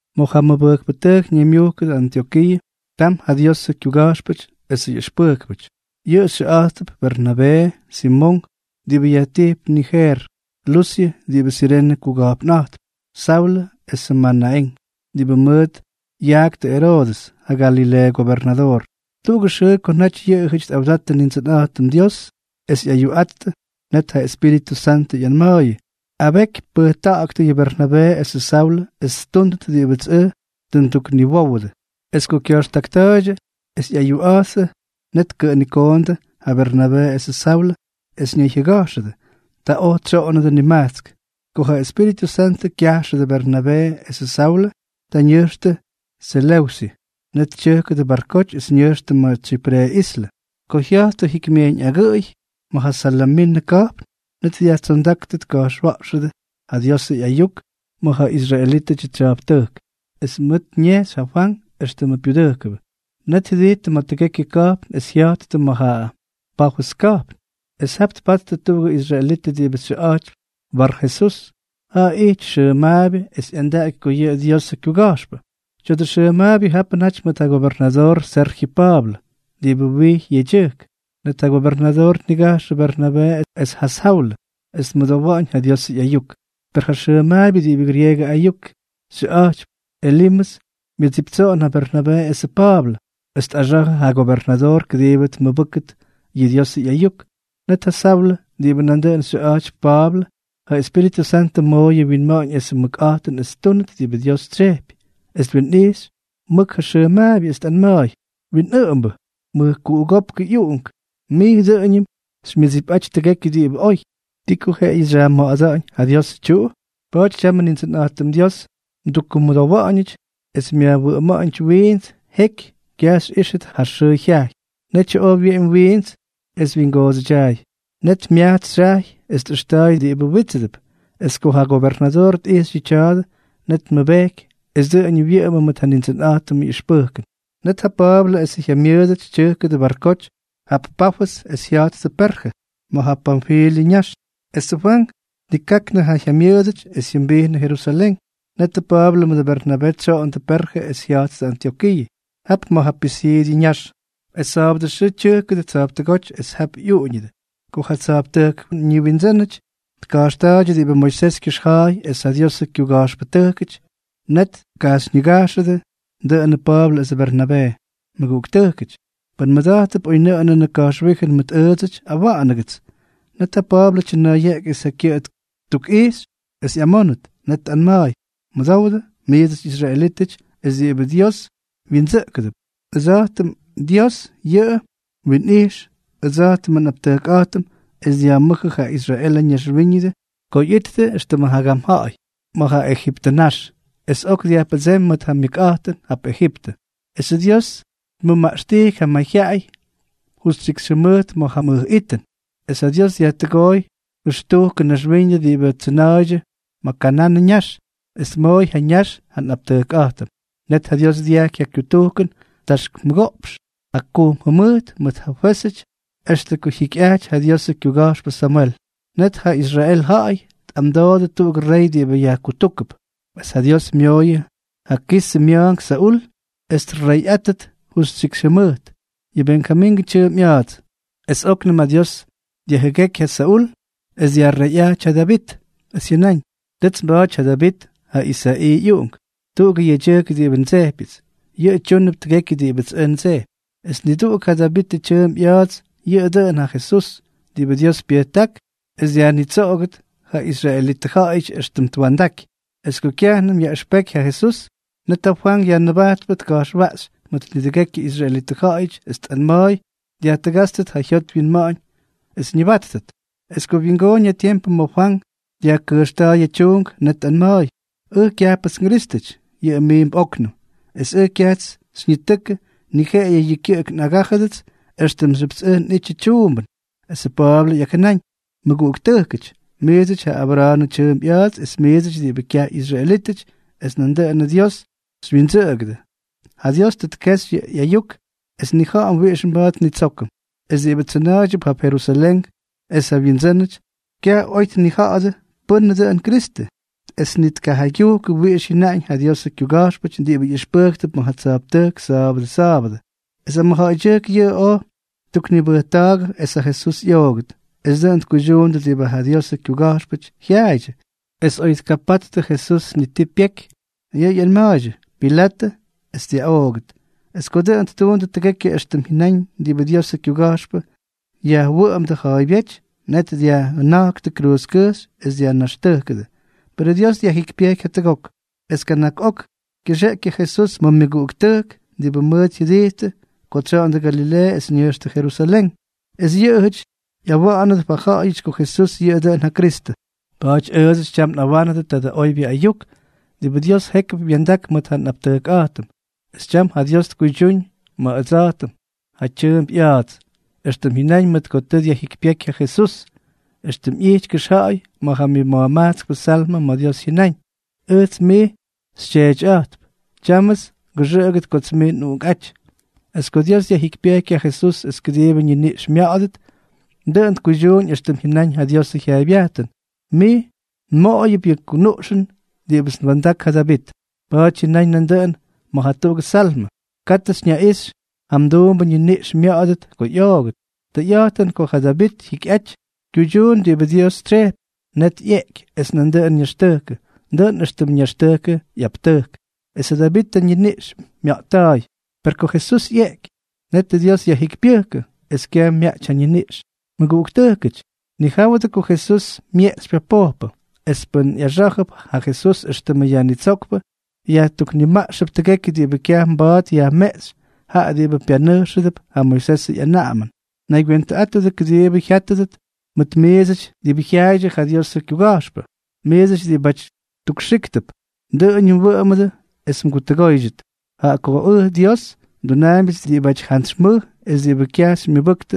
Ma̱ ja mʉbʉjkpʉtʉjk ñaymyʉ́kʉdʉ Antyokiiʉ, tam ja Diosʉ kyuga̱jxpʉty esʉ yaꞌʉxpʉjkpʉty. Yʉꞌʉ xyʉꞌa̱jttʉp: Bernabee, Simonk (diꞌibʉ yajtijp Nijeer), Lusyʉ (diꞌibʉ Sirene kuga̱jpnꞌa̱jtp), Saulʉ esʉ Manaén (diꞌibʉ mʉʉt yaꞌktʉ Eroodʉs, ja Galileeʉ gobernadoor). Tuꞌugʉ xʉʉ ko naty yʉꞌʉjʉty tꞌawdattʉ Nindsʉnꞌa̱jtʉm Dios es ꞌyayuꞌa̱jttʉ, net ja Espíritʉ Santʉ ꞌyanma̱a̱yʉ: —Abeky pʉjta̱ꞌa̱ktʉ yʉ Bernabee esʉ Saulʉ es ttúndʉt diꞌibʉts ʉj tʉ ndukniwówʉdʉ. Es ko kya̱jxtakta̱a̱ydyʉ es ꞌyayuꞌa̱jttʉ, net tkʉꞌʉnikoondʉ ja Bernabee esʉ Saulʉ es ñayjyʉga̱jxʉdʉ. Ta oj tsyoꞌonnʉdʉ nimajtsk. Ko ja Espíritʉ Santʉ kyajxʉdʉ Bernabee esʉ Saulʉ, ta ñʉjxtʉ Seleusyʉ. Net tyʉjkʉdʉ barkoty es ñʉjxtʉ ma̱ Tsyipre islʉ. Ko jya̱jttʉ jikymyejyñ agʉꞌʉy ma̱ ja Salaminʉ ka̱jpn, net dyajtsondáktʉ tka̱jxwa̱ꞌxʉdʉ ja Diosʉ ꞌyayuk ma̱ ja israelítʉdyʉ tsya̱jptʉjk. Es mʉt ñejxy ja Fwank éxtʉmʉ pyudʉjkʉbʉ. Net jyʉdijttʉ ma̱ tʉgekyʉ ka̱jpn es jya̱jttʉ ma̱ ja Pafʉs ka̱jpn. Es jap tpattʉ tuꞌugʉ israelitʉ diꞌibʉ xyʉꞌa̱jtypy Barjesús. Jaꞌa ijty xʉmaabyʉ es ꞌyandaꞌaky ko yʉꞌʉ Diosʉ kyuga̱jxpʉ. Tya̱dʉ xʉmaabyʉ japʉ naty mʉt ja gobernadoor Serjyʉ Pa̱a̱blʉ, diꞌibʉ wijy yedyʉjk. Net ja gobernadoor tnigajxʉ Bernabee es ja Saulʉ es tmʉdowa̱ꞌa̱ñ ja Diosʉ ꞌyayuk. Per ja xʉmaabyʉ diꞌibʉ grieegʉ ayuk xyʉꞌa̱jtypy Elimʉs myʉdsiptsoꞌon ja Bernabee esʉ Pa̱a̱blʉ, es tꞌaga̱jxʉ ja gobernadoor kʉdiibʉ tmʉbʉ́kʉt yʉ Diosʉ ꞌyayuk. Net ja Saulʉ, diꞌibʉ nandʉꞌʉn xyʉꞌa̱jtypy Pa̱a̱blʉ, ja Espíritʉ Santʉ mooyʉ winma̱ꞌa̱ñ esʉ mʉkꞌa̱jtʉn es ttúnʉt diꞌibʉ Dios tsyejpy, es twinꞌijxy mʉk ja xʉmaabyʉ, es tꞌanma̱a̱y: —¡Winꞌʉꞌʉmbʉ, mʉjkuꞌugópkʉ ꞌyuꞌunk, mij dʉꞌʉñʉm xymyʉdsipꞌaty tʉgekyʉ diꞌibʉ oy! ¿Ti ko jeꞌeyʉ xyajma̱ꞌa̱da̱ꞌa̱ñ ja Diosʉ tyuꞌu? Pa̱a̱ty tyamʉ Nindsʉnꞌa̱jtʉm Dios mdukkumʉdowa̱ꞌa̱ñʉty es myajwʉꞌʉma̱ꞌa̱ñʉty wiints, jeky kyaj xyꞌíxʉt ja xʉʉ jyajy. Netyʉ oj wyeꞌemy wiints es wyingoodsʉdyaay. Net myajtsy xyajy es tꞌʉxta̱a̱y diꞌibʉ wítsʉdʉp. Es ko ja gobernadoor tꞌijxy yʉ tya̱a̱dʉ, net tmʉbejky es dʉꞌʉñʉ wyʉꞌʉmʉ mʉt ja Nindsʉnꞌa̱jtʉmʉ ꞌyʉxpʉjkʉn. Net ja Pa̱a̱blʉ esʉ jyamyʉʉdʉty tyʉjkʉdʉ barkoty jap Pafʉs es jya̱jttʉ Perjʉ, ma̱ ja Panfilyʉ ñax. Esʉ Fwank tnikaknʉ ja jyamyʉʉdʉty es jyʉmbijnʉ Jerusalén. Netʉ Pa̱a̱blʉ mʉdʉ Bernabee tsyoꞌondʉ Perjʉ es jya̱jttʉ Antyokiiʉ, jap ma̱ ja Pisiidyʉ ñax. Es sa̱a̱bʉdʉ xʉʉ tyʉjkʉdʉ tsa̱jptʉgóty es jap ꞌyuꞌuñʉdʉ. Ko ja tsa̱jptʉjkʉ ñiwindsʉ́nʉty tka̱jxta̱a̱ydyʉ diꞌibʉ Moisés kyʉxja̱a̱y es ja Diosʉ kyuga̱jxpʉtʉjkʉty, net tkajxyñigajxʉdʉ dʉꞌʉnʉ Pa̱a̱blʉ esʉ Bernabee: —Mʉguꞌuktʉjkʉty, pʉn mmʉda̱jttʉp oynʉꞌʉnʉnʉ ka̱jxwíjʉn mʉt ʉʉdsʉty, awa̱ꞌa̱nʉgʉts. Net ja Pa̱a̱blʉ tyʉna̱a̱yeꞌky es ja kyʉꞌʉ ttukꞌijxy es ꞌyamónʉt. Net tꞌanma̱a̱y: —Mʉdowdʉ, miits israelítʉty es diꞌibʉ Dios wyindsʉꞌkʉdʉp. Dios yʉꞌʉ wyinꞌijx ʉdsa̱jtʉmʉ nꞌaptʉjkꞌa̱jtʉm es dyajmʉ́jʉ ja Israelʉ ñaxwíñʉdʉ ko ꞌyijttʉ éxtʉmʉ jagam ja̱ꞌa̱y ma̱ ja Ejiptʉ ñax. Es ok dyajpʉdseemy mʉt ja myʉkꞌa̱jtʉn jap Ejiptʉ. Esʉ Dios tmʉmaꞌxtijky ja mayjyaꞌay justyikxy jʉmʉjt ma̱ ja mʉj itʉn, es ja Dios dyajtʉgooy jʉxtujkʉ naxwíñʉdʉ diꞌibʉ tsʉna̱a̱ydyʉ ma̱ Kananʉ ñaxy, es tmooy ja ñax ja nꞌaptʉjkꞌa̱jtʉm. Net ja Dios dyajky ja kyutujkʉn taxk mʉgoꞌpx jakujm jʉmʉjt mʉt ja fwézʉty extʉ ko jyikyꞌajty ja Diosʉ kyuga̱jxpʉ Samwel. Net ja Israel ja̱ꞌa̱y tꞌamdoodʉ tuꞌugʉ rey diꞌibʉ yajkutúkʉp. Es ja Dios myooyʉ ja Kisʉ mya̱a̱nk Saúl es treyꞌátʉt justyikxy jʉmʉjt. Yʉꞌʉ Benjamingʉ tyʉʉmp ꞌya̱a̱ts. Es óknʉm ja Dios dyajjʉgéky ja Saúl es dyajreyꞌajty ja Davit, es jyʉnáñ: “Tʉts nba̱a̱ty ja Davit, ja Isa̱ꞌii ꞌyuꞌunk, tuꞌugʉ yedyʉjk diꞌibʉ ndsejpyʉts. Yʉꞌʉ tyúnʉp tʉgekyʉ diꞌibʉts ʉj ndsejpy.” ’Esʉ niduꞌuk ja Davitʉ tyʉʉmp ꞌya̱a̱ts yʉꞌʉ dʉꞌʉn ja Jesús, diꞌibʉ Dios pyʉjták es dyajnitsoꞌogʉt ja israelitʉ ja̱ꞌa̱yʉty éxtʉm twa̱ndaky. Es ko kyajnʉm yaꞌʉxpeky ja Jesús, net ja Fwank Yajnʉbajtpʉ tka̱jxwaꞌxy mʉt nidʉgekyʉ israelitʉ ja̱ꞌa̱yʉty es tꞌanma̱a̱y dyajtʉgátstʉt yʉ jyot wyinma̱ꞌa̱ñ, ñʉbáttʉt. Es ko wyingóñ ja tiempʉ ma̱ Fwank dyajkʉjxta̱a̱y ja tyuunk, net tꞌanma̱a̱y: “Ʉj kyajpʉts nGrístʉty. Yʉꞌʉ miimp óknʉm. Es ʉj kyajts xyñitʉkʉ, ni jeꞌeyʉ yʉ kyʉꞌʉk ngaꞌꞌagájʉdʉt éxtʉmxyʉpts ʉj nꞌítyʉts tyuumbʉn.” Esʉ Pa̱a̱blʉ ꞌyakjʉnáñ: —Mʉguꞌuktʉjkʉty, miidsʉty ja Abra̱a̱nʉ tyʉʉmp ꞌya̱a̱ts es miidsʉty diꞌibʉ kyaj ꞌyisraelítʉty es nandʉꞌʉnʉ Dios xywyindsʉꞌʉgʉdʉ, ja Dios tʉ tkexy yʉ ꞌyayuk es nnija̱ꞌa̱m wiꞌix mba̱a̱t nnitsókʉm. Es diꞌibʉ tsʉna̱a̱ydyʉp jap Jerusalén es ja wyindsʉ́nʉty, kyaj oy tnija̱ꞌa̱dʉ pʉ́nʉ dʉꞌʉn Kristʉ, es ni tkajaygyujkʉ wiꞌix jyʉnáñ ja Diosʉ kyuga̱jxpʉty diꞌibʉ ꞌyʉxpʉjktʉp ma̱ ja tsa̱jptʉjk sa̱a̱bʉdʉ sa̱a̱bʉdʉ. Es ja mʉjja̱ꞌa̱ydyʉjk yʉꞌʉ oj ttuknibʉjta̱a̱gʉdʉ esʉ Jesús ꞌyoogʉt, es dʉꞌʉn tkuydyuundʉ diꞌibʉ ja Diosʉ kyuga̱jxpʉty jyaaydyʉ. Es oy tkapattʉ Jesús ni ti pyeky, yʉꞌʉ ꞌyanma̱a̱ydyʉ Pilatʉ es dyaꞌoogʉt. Es ko dʉꞌʉn ttuundʉ tʉgekyʉ éxtʉm jyʉnáñ diꞌibʉ Diosʉ kyuga̱jxpʉ yajwʉꞌʉmdʉ ja̱a̱ybyéty, net dyajjʉna̱jktʉ kruuzkʉjxy es dyajnaxtʉjkʉdʉ. Perʉ Dios dyajjikypyejky jatʉgok, es kana̱k ok kyʉxeꞌky ja Jesús ma̱ ja myʉguꞌuktʉjk diꞌibʉ mʉʉt jyʉdijttʉ ko tsyoꞌondʉ Galileeʉ es ñʉjxtʉ Jerusalén, es yʉꞌʉjʉty ꞌyawa̱ꞌa̱nʉdʉp ja ja̱ꞌa̱yʉty ko Jesús yʉꞌʉ dʉꞌʉn ja Kristʉ. ’Pa̱a̱ty ʉʉdsʉty tyam nꞌawánʉdʉ tadʉ oybyʉ ayuk diꞌibʉ Dios jékyʉp wya̱ndak mʉt ja nꞌaptʉjkꞌa̱jtʉm. Es tyam ja Dios tkuydyúñ ma̱ ʉdsa̱jtʉm, jaꞌa tyʉʉmp ꞌya̱a̱ts, éxtʉm jyʉnáñ mʉt ko tʉ dyajjikypyéky ja Jesús, éxtʉm ꞌyity kʉxja̱ꞌa̱y ma̱ ja myʉmajtskpʉ Salmʉ ma̱ Dios jyʉnáñ: “Ʉjts mij xyTyeetyꞌa̱jtp. Tyámʉts ngʉxʉꞌʉgʉt kots mij nꞌUꞌunkꞌáty.” Es ko Dios dyajjikypyejky ja Jesús es kʉdiibʉ ñiniꞌx mya̱ꞌa̱dʉt, dʉꞌʉn tkuydyuuñ éxtʉm jyʉnaꞌañ ja Diosʉ jyaaybyajtʉn: “Mij nmoꞌoyʉp yʉ kunuꞌxʉn diꞌibʉts nwa̱ndak ja Davit.” Pa̱a̱ty jyʉnaꞌañ nandʉꞌʉn ma̱ jatuꞌugʉ Salmʉ: “Katʉ xyñaꞌixy ja mduumbʉ ñiniꞌx mya̱ꞌa̱dʉt ko ꞌyoogʉt.” Tʉyꞌa̱jtʉn ko ja Davit jyikyꞌajty, kyuydyuun diꞌibʉ Dios tsyejpy, net ꞌyeꞌky es nandʉꞌʉn ñaxtʉjkʉ, dʉꞌʉn éxtʉm ñaxtʉjkʉ ꞌyaptʉjk, es ja Davit ñiniꞌx mya̱ꞌtta̱a̱y. Per ko Jesús ꞌyeꞌky, netʉ Dios yajjikypyʉjkʉ, es kyaj myaꞌty ja ñiniꞌx. Mʉguꞌuktʉjkʉty, nijáwʉdʉ ko Jesús myeꞌxypy ja pojpʉ. Es pʉ́n ꞌyaxá̱jʉp ja Jesús éxtʉmʉ Yajnitsókpʉ, yajtuknimaꞌxp tʉgekyʉ diꞌibʉ kyaj mba̱a̱t yajmeꞌxy jaꞌa diꞌibʉ pyanʉjxʉdʉp ja Moisesʉ ꞌyanaꞌamʉn. Naygywentʉꞌátʉdʉ kʉdiibʉ jyátʉdʉt mʉt miidsʉty diꞌibʉ jyaaydyʉ ja Diosʉ kyuga̱jxpʉ: Miidsʉty diꞌibáty tukxíktʉp, dʉꞌʉñʉ wʉꞌʉmʉdʉ es mgutʉgóydyʉt, jaꞌa ko ʉj Dios, ndunaambyʉts diꞌibʉty jantsy mʉj, diꞌibʉ kyaj xymyʉbʉktʉ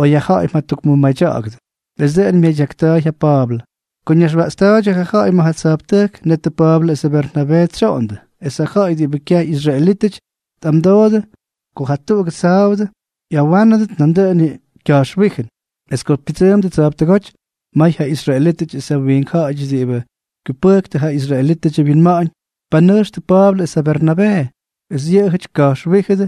oy ja ja̱ꞌa̱y mjatukmʉmadya̱ꞌa̱gʉdʉ. Es dʉꞌʉn myadyakta̱a̱y yʉ Pa̱a̱blʉ. Ko ñaywya̱ꞌxta̱a̱yʉdʉ ja ja̱ꞌa̱y ma̱ ja tsa̱jptʉjk, netʉ Pa̱a̱blʉ esʉ Bernabee tsyoꞌondʉ. Es ja ja̱ꞌa̱y diꞌibʉ kyaj ꞌyisraelítʉty tꞌamdoodʉ ko jatuꞌugʉ sa̱a̱bʉdʉ ꞌyawánʉdʉt nandʉꞌʉn yʉ ka̱jxwíjʉn. Es ko pyʉdsʉʉmdʉ tsa̱jptʉgóty, may ja israelítʉty es ja wiink ja̱ꞌa̱yʉty diꞌibʉ kyupʉjktʉ ja israelítʉdyʉ wyinma̱ꞌa̱ñ, tpanʉjxtʉ Pa̱a̱blʉ es ja Bernabee. Es yʉꞌʉjʉty ka̱jxwíjʉdʉ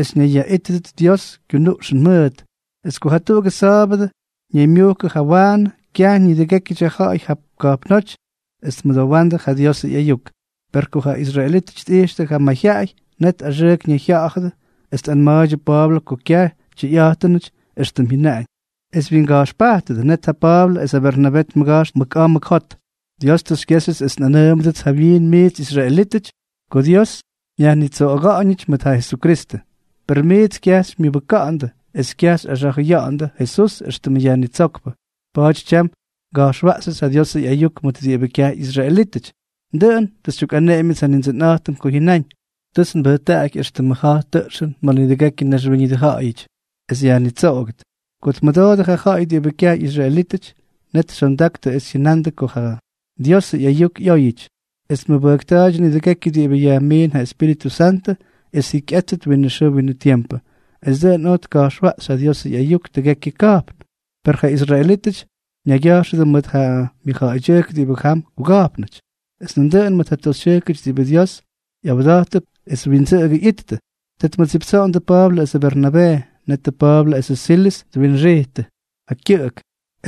es ñayyaꞌítʉdʉt Diosʉ kyunuꞌxʉn mʉʉt. Es ko jatuꞌugʉ sa̱a̱bʉdʉ ñaymyujkʉ jawaanʉ kyaj nidʉgékyʉdyʉ ja̱ꞌa̱y jap ka̱jpnóty es tmʉdowa̱ꞌa̱ndʉ ja Diosʉ ꞌyayuk. Per ko ja israelítʉty tꞌijxtʉ ja mayjyaꞌay, net axʉʉk ñayjya̱ꞌa̱dʉ es tꞌanma̱a̱ydyʉ Pa̱a̱blʉ ko kyaj tyʉyꞌa̱jtʉnʉty éxtʉm jyʉnaꞌañ, es wyinga̱jxpajtʉdʉ. Net ja Pa̱a̱blʉ es ja Bernabee tmʉga̱jxtʉ mʉk a̱a̱ mʉk jot: —Dios tʉ xykyéxyʉts es nꞌanʉʉmʉdʉts jawyiin miits israelítʉty, ko Dios myajnitsoꞌoga̱ꞌa̱ñʉty mʉt ja Jesukristʉ. Per miits kyaj xymyʉbʉka̱ꞌa̱ndʉ es kyaj xyꞌaxa̱jʉya̱ꞌa̱ndʉ Jesús éxtʉmʉ mYajnitsókpʉ, pa̱a̱ty tyam nga̱jxwaꞌxyʉts ja Diosʉ ꞌyayuk mʉt diꞌibʉ kyaj ꞌyisraelítʉty. Dʉꞌʉn tʉ xytyukꞌaneꞌemyʉts ja Nindsʉnꞌa̱jtʉm ko jyʉnáñ: Tʉts nbʉjtaꞌaky éxtʉmʉ ja̱j tʉꞌxʉn ma̱ nidʉgekyʉ naxwíñʉdʉ ja̱ꞌa̱yʉty, es dyajnitsoꞌogʉt. Ko tmʉdoodʉ ja ja̱ꞌa̱y diꞌibʉ kyaj ꞌyisraelítʉty, net xyondaktʉ es jyʉnandʉ ko ja Diosʉ ꞌyayuk ꞌyóyʉty. Es tmʉbʉjkta̱a̱ydyʉ nidʉgekyʉ diꞌibʉ yajmiin ja Espíritʉ Santʉ es jyikyꞌátʉt winʉ xʉʉ winʉ tiempʉ. Es dʉꞌʉn oj tka̱jxwaꞌxy ja Diosʉ ꞌyayuk tʉgekyʉ ka̱jpn. Per yʉ israelítʉty ñaygya̱jxʉdʉ mʉt ja myʉjja̱ꞌa̱ydyʉjk diꞌibʉ jam kuga̱jpnʉty, es nandʉꞌʉn mʉt ja toxytyʉjkʉty diꞌibʉ Dios ꞌyawda̱jttʉp es windsʉꞌʉgʉ ꞌyittʉ, ta tmʉdsiptsoꞌondʉ Pa̱a̱blʉ esʉ Bernabee. Netʉ Pa̱a̱blʉ esʉ Silʉs twinxijttʉ ja kyʉꞌʉk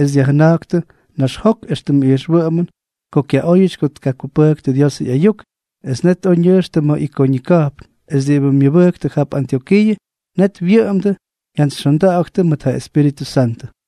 es dyajjʉna̱jktʉ naxjok éxtʉmʉ ijxwʉꞌʉmʉn ko kyaꞌóyʉty ko tkakupʉktʉ ja Diosʉ ꞌyayuk. Es net oj ñʉjxtʉ ma̱ Ikoñʉ ka̱jpn. Es diꞌibʉ myʉbʉjktʉ jap Antyokiiʉ, net wyʉꞌʉmdʉ jyantsyxyondaktʉ mʉt ja Espíritʉ Santʉ.